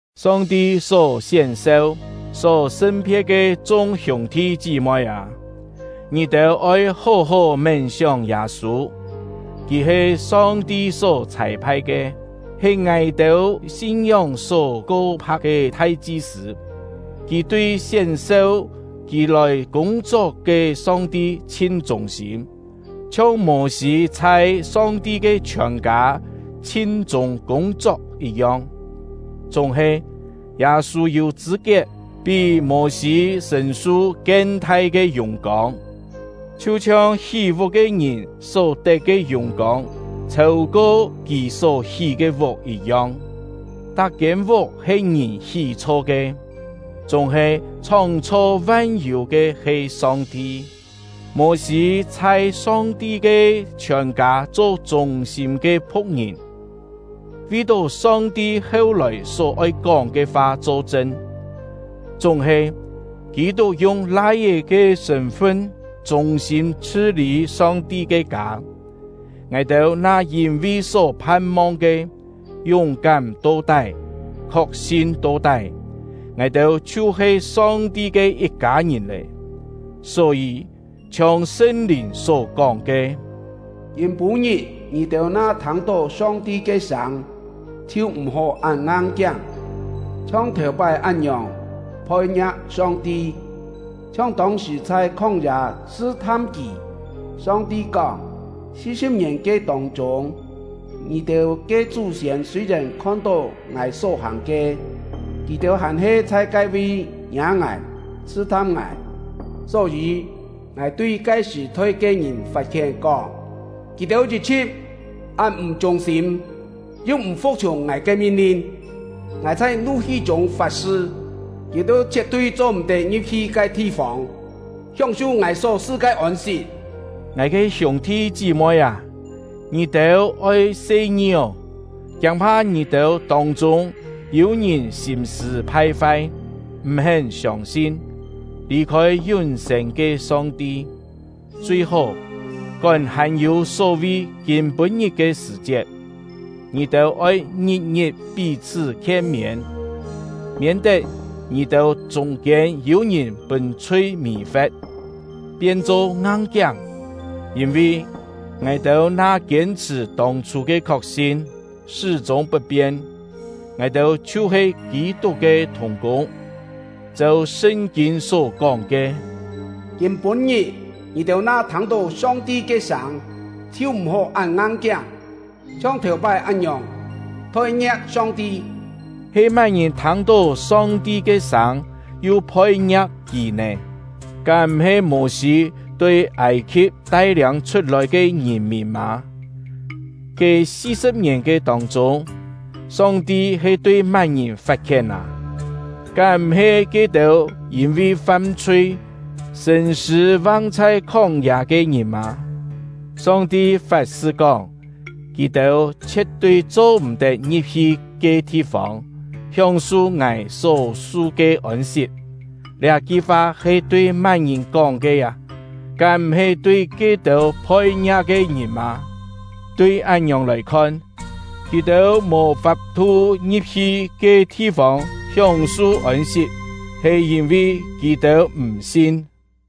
Song-ti só sién-seu, só sṳn-phe̍t ke chung hiûng-thi chí-moi â! Ngì-têu oi hó-hó mén-sióng Yâ-sû; kì he Song-ti só chhâi-phai ke, he ngài-têu sin-ngióng só ko-pha̍k ke thai-chi-sṳ̂. Kì tui sién-seu kì lòi kûng-chok ke Song-ti chhin chûng-sîm, chhiong Mô-sî chhai Song-ti ke chhiòn-kâ chhin-chûng kûng-chok yit-yong. Chúng-he, Yâ-sû yû chṳ̂-kiet pí Mô-sî sṳ̀n-su kien-thai ke yùng-kông; chhiu-chhiong hí-vuk ke ngìn só tet ke yùng-kông chhêu-ko kì só hí ke vuk yit-yong. Tak-kiên vuk he ngìn hí-chho ke, chúng-he chhóng-chho van-yû ke he Song-ti. Mô-sî chhai Song-ti ke chhiòn-kâ cho chûng-sîm ke phu̍k-ngìn, vi-tó Song-ti heu-lòi só-oi kóng ke fa cho-chṳn; chúng-he, Kî-tuk yung Lai-é ke sṳ̂n-fun chûng-sîm chhṳ-lî Song-ti ke kâ. Ngài-têu na yîn-vi só phan-mong ke, yúng-kám to-tái, khok-sin to-tái, ngài-têu chhiu-he Song-ti ke yit-kâ ngìn lé. Só-yî, chhiong Sṳn-Lìn só-kóng ke: Kîm-pû-ngit, ngì-têu na thâng-tó Song-ti ke sâng, chhiu m̀-hó án ngang-kiáng, chhiong thèu-pái án-ngiòng phoi-ngia̍k Song-ti, chhiong tông-sṳ̀ chhai khóng-yâ sṳ-tham Kì. Song-ti kóng: Si-sṳ̍p ngièn ke tông-chûng, ngì-têu ke chú-siên sûi-yèn khon-tó Ngài só hàng ke, kì-têu hàn-he chhai ke-vi ngiâ Ngài, sṳ-tham Ngài. Só-yî, Ngài tui ke sṳ̀-thoi ke ngìn fat-khién, kóng: “Kì-têu yit-chhṳ̍t án m̀ chûng-sîm, yu m̀ fu̍k-chhiùng Ngài ke min-lin.” Ngài chhai nu-hi chûng fat-sṳ: “Kì-têu chhie̍t-tui cho-m̀-tet ngi̍p-hi ke thi-fông hióng-su Ngài só-su ke ôn-sit!” Ngài ke hiûng-thi chí-moi â, ngì-têu oi se-ngi ô! Kiâng-pha ngì-têu tông-chûng yû ngìn sîm-sṳ̂ phai-fai, m̀-hén siông-sin, lì-khôi yún-sên ke Song-ti. Chui-hó, kón hàn-yû só-vi “Kîm-pû-ngit” ke sṳ̀-chiet, ngì-têu oi ngit-ngit pí-chhṳ́ khien-miên, miên-tet ngì-têu chûng-kiên yû ngìn pûn chhui mì-fe̍t, pien-cho ngang-kiáng. Yîn-vi, ngài-têu na kiên-chhṳ̀ tông-chhû ke khok-sin, sṳ́-chûng put-pien, ngài-têu chhiu-he Kî-tuk ke thùng-kûng. Cheu Sṳn-kîn só-kóng ke: Kîm-pû-ngit, ngì-têu na thâng-tó Song-ti ke sâng, chhiu m̀-hó án ngang-kiáng, chhiong thèu-pái án-ngiòng phoi-ngia̍k Song-ti. He má-ngìn thâng-tó Song-ti ke sâng yu phoi-ngia̍k Kì nè? Kám m̀-he Mô-sî tui Âi-khi̍p tai-liâng chhut-lòi ke ngìn-mìn mâ? Ke si-sṳ̍p ngièn ke tông-chûng, Song-ti he tui má-ngìn fat-khién â? Kám m̀-he ke-têu yîn-vi fam-chhui, sṳ̂n-sṳ̂ vang chhai khóng-yâ ke ngìn mâ? Song-ti fat-sṳ kóng: “Kì-têu chhie̍t-tui cho-m̀-tet ngi̍p-hi ke thi-fông hióng-su Ngài só-su ke ôn-sit!” Liá-ki fa he tui má-ngìn kóng ke â? Kám m̀-he tui ke-têu phoi-ngia̍k ke ngìn mâ? Tui án-ngiòng lòi khon, kì-têu mò fap-thu ngi̍p-hi ke thi-fông hióng-su ôn-sit he yîn-vi kì-têu m̀-sin.